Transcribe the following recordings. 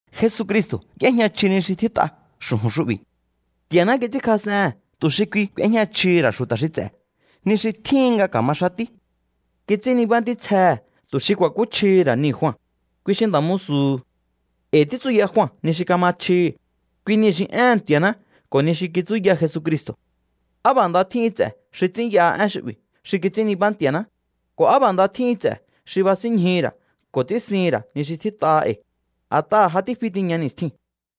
Jesucristo̱ y'éjña chji ni xi tjít'a xu̱ju̱n xu'bi̱. Nti̱a̱ná kits'ínkjas'ehe̱n tu̱ xi kui ku̱éjña chjihi̱ ra̱ xu̱ta̱ xi ts'e̱ ni xi tjíhin nga ka̱ma xatí. Kits'ín nibá ntítsjehe̱ tu̱ xi ku̱a̱kúchjihi̱ ra̱ nii̱ Jua, kui xi nda̱ musu̱hu̱. E̱i̱ títsuya Jua ni xi kama chjihi̱, kui niu̱ xi éhe̱n Nti̱a̱ná ko̱ ni xi kitsúya Jesucristo̱. ¡Á b'a̱ nda tjíhin ts'e̱ xi ts'ínyaha én xu'bi̱ xi kits'ín nibá Nti̱a̱ná, ko̱ á b'a̱ nda tjíhin ts'e̱ xi basínñjuhu̱ ra̱ ko̱ ts'ínsihi̱n ra̱ ni xi tjít'aha e̱i̱, a̱t'aha̱ ja tífi tiña ni̱stjiu̱n!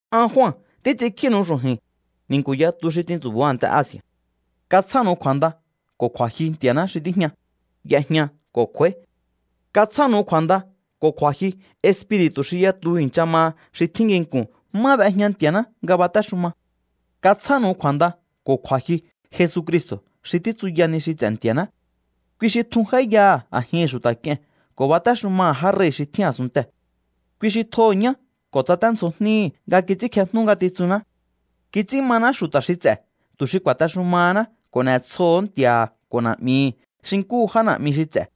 An Jua títs'inkjínu̱u xu̱ju̱i̱n, ni̱nku̱ yatu xi tintsu̱bo̱o a̱nte Asi̱a̱. Katsjánu̱u kju̱a̱nda ko̱ kju̱a̱jyu Nti̱a̱ná xi tíjña, y'ejña ko̱ kj'u̱a̱í. Katsjánu̱u kju̱a̱nda ko̱ kju̱a̱jyu espiri̱tu̱ xi yatu i̱ncha maha xi tjín nginku̱n má b'ejña Nti̱a̱ná nga batéxuma. Katsjánu̱u kju̱a̱nda ko̱ kju̱a̱jyu Jesucristo̱ xi títsuya ni xi ts'e̱ Nti̱a̱ná. Kui xi tjun j'áíyaha̱ a̱jihi̱n xu̱ta̱ k'ie̱n ko̱ batéxumaha̱ já rei̱ xi tjín a̱sunntee̱. Kui xi tjoho̱ ñá ko̱ tsaténdzjo jníhi̱ nga kits'ínkjejnú ngatitsunná. Kits'ín maná xu̱ta̱ xi ts'e̱ tu̱ xi ku̱a̱texumahaná ko̱ n'e̱tsjoo̱hó Nti̱a̱ha̱ ko̱ Na̱'mihi̱ xi nkúhu já na̱'mi xi ts'e̱.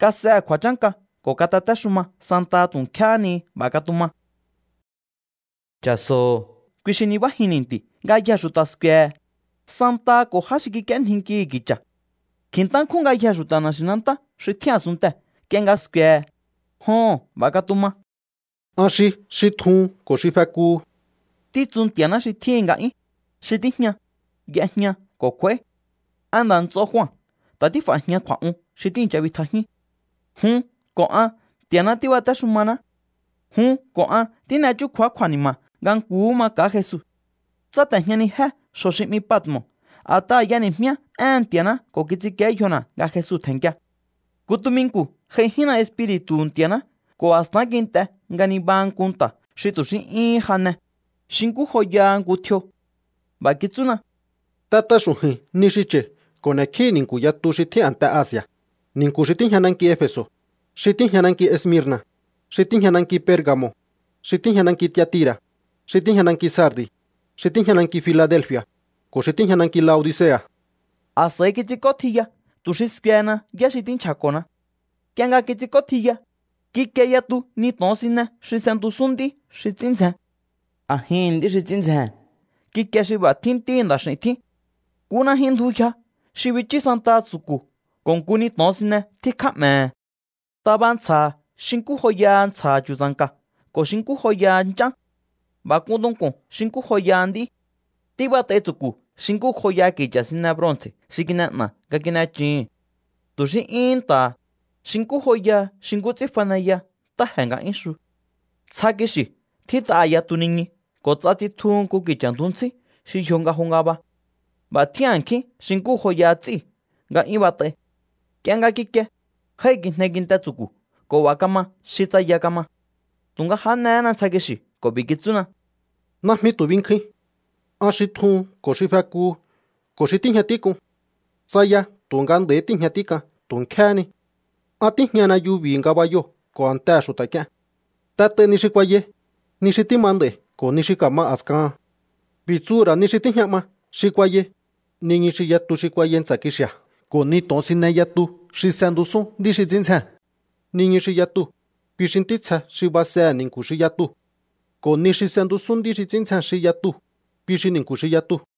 ¡Kas'ehe̱ kju̱a̱chánka ko̱ katatéxuma santaha tu̱ nkjéhé ni! B'a̱ katuma. ¡Cha̱so̱o, kui xi nibájin ni̱nti̱u̱! Ngayjee̱ xu̱ta̱ sku̱e̱he̱, santaha ko̱ já xi kik'íénjinkihi̱ ki̱cha̱. Kji̱ntá nkjún ngayjee̱ xu̱ta̱ na̱xi̱nantá xi tjín a̱sunntee̱ nk'ie nga sku̱e̱he̱. Joho̱n, b'a̱ katuma. “An xi xi tjuhun ko̱ xi fekuhu”, títsu Nti̱a̱ná xi tjíhi̱n nga'yún, xi tíjña, y'ejña ko̱ kj'u̱a̱í. An nda̱ nts'o Jua ta̱ tíf'a̱jian kju̱a̱'un xi tíi̱ncha bitjajíún. Jun ko̱ an Nti̱a̱ná tíbatéxumaná. Jun ko̱ an tín'e chúkju̱á kju̱a̱ni̱ma̱ nga nkuhú maka̱á Jesu. Tsáte̱jñanijé xjo̱ xi 'mi Patmo̱ a̱t'aha̱ y'eni̱jmíá éhe̱n Nti̱a̱ná ko̱ kits'inkíé yjona̱ nga Jesu tje̱nnkia. Nku tuminku̱ j'aijínna Espiri̱tu̱hu̱ Nti̱a̱ná ko̱ a̱stán kint'e nga nibaha nku nta̱ xi tu̱ xí 'yúhún jane, xi nkú joyaha nku tjio. B'a̱ kitsúna: —T'et'a xu̱ju̱i̱n ni xi cha̱i̱ ko̱ n'e̱kjíhi̱ ni̱nku̱ yatu xi tjín a̱nte Asi̱a̱, ni̱nku̱ xi tíjña nanki Efe̱so̱, xi tíjña nanki Esmirna̱, xi tíjña nanki Perga̱mo̱, xi tíjña nanki Tiatira̱, xi tíjña nanki Sardi̱, xi tíjña nanki Filadelfi̱a̱, ko̱ xi tíjña nanki Laodicea̱. A̱s'a̱i kits'ink'ótjiya tu̱ xi skuehena yá xi tínchja̱ko̱na. Nk'ie nga kits'ink'ótjiya, kikie yatu ni to̱onsine xi s'entusún nd'í xi ts'ín ndzjen. A̱jihi̱n nd'í xi ts'ín ndzjee̱n kikie xi b'a̱ tjín Ntíhi̱ Nda̱x'i̱u̱n tjín. Nku najyun ndju yja xi bichú santaha tsu̱ku̱ ko̱ nku ni to̱onsine tjíkjá 'me̱he̱. Taba ntsja̱ha̱ xi nkú joyaha ntsja̱ha̱ chu̱tsa̱nka̱ ko̱ xi nkú joyaha nch'án. B'a̱ k'un tunku̱n xi nkú joyaha nd'í. Tíbat'ai tsu̱ku̱ xi nkú joyaha ki̱cha̱ sine bronce̱ xi kin'e'na̱ nga kin'echuhu̱n. Tu̱ xí 'yún nta̱ha̱, xi nkú joyaha xi nkú ts'ín faneya ntáje̱ nga 'yún xu. Ntsja kixi̱ tjít'aha̱ yatu niñu ko̱ ts'a tsitjuhu nku ki̱cha̱ ndju ntsí xi yjo nga jo ngaba. B'a̱ tjín a̱nkjín xi nkú joyaha ts'íu̱ nga 'yún bat'ai. Nk'ie nga kikie, jái̱kijne kinte tsu̱ku̱ ko̱ b'a̱ kama xi tsaya kama. Tu̱nga jánehéna ntsja kixi̱ ko̱ b'i̱ kitsúna: —Najmi tu̱ binkjuin. An xi tjuhun ko̱ xi fekuhu ko̱ xi tíjña tík'un. Tsaya tu̱nga nd'a̱i̱ tíi̱jña tík'an tu̱ nkjéhé ni. An tíjñana yubi̱hi̱ ngabayoo̱ ko̱ a̱ntehe̱ xu̱ta̱ k'ie̱n. T'et'ai ni xi kuayai, ni xi tíma nd'a̱i̱ ko̱ ni xi ka̱ma a̱skahan. B'i̱ tsuhu̱ ra̱ ni xi tíjña 'ma xi kuayai, niñu xi yatu xi kuayai ntsa̱ kixi̱a̱ ko̱ ni to̱onsine yatu xi s'entusún nd'í xi ts'ín ndzjee̱n. Niñu xi yatuu̱, kui xi ntítsje xi basehe̱ ni̱nku̱ xi yatuu̱. Ko̱ ni xi s'entusún nd'í xi ts'ín ndzjen xi yatuu̱, kui xi ni̱nku̱ xi yatuu̱.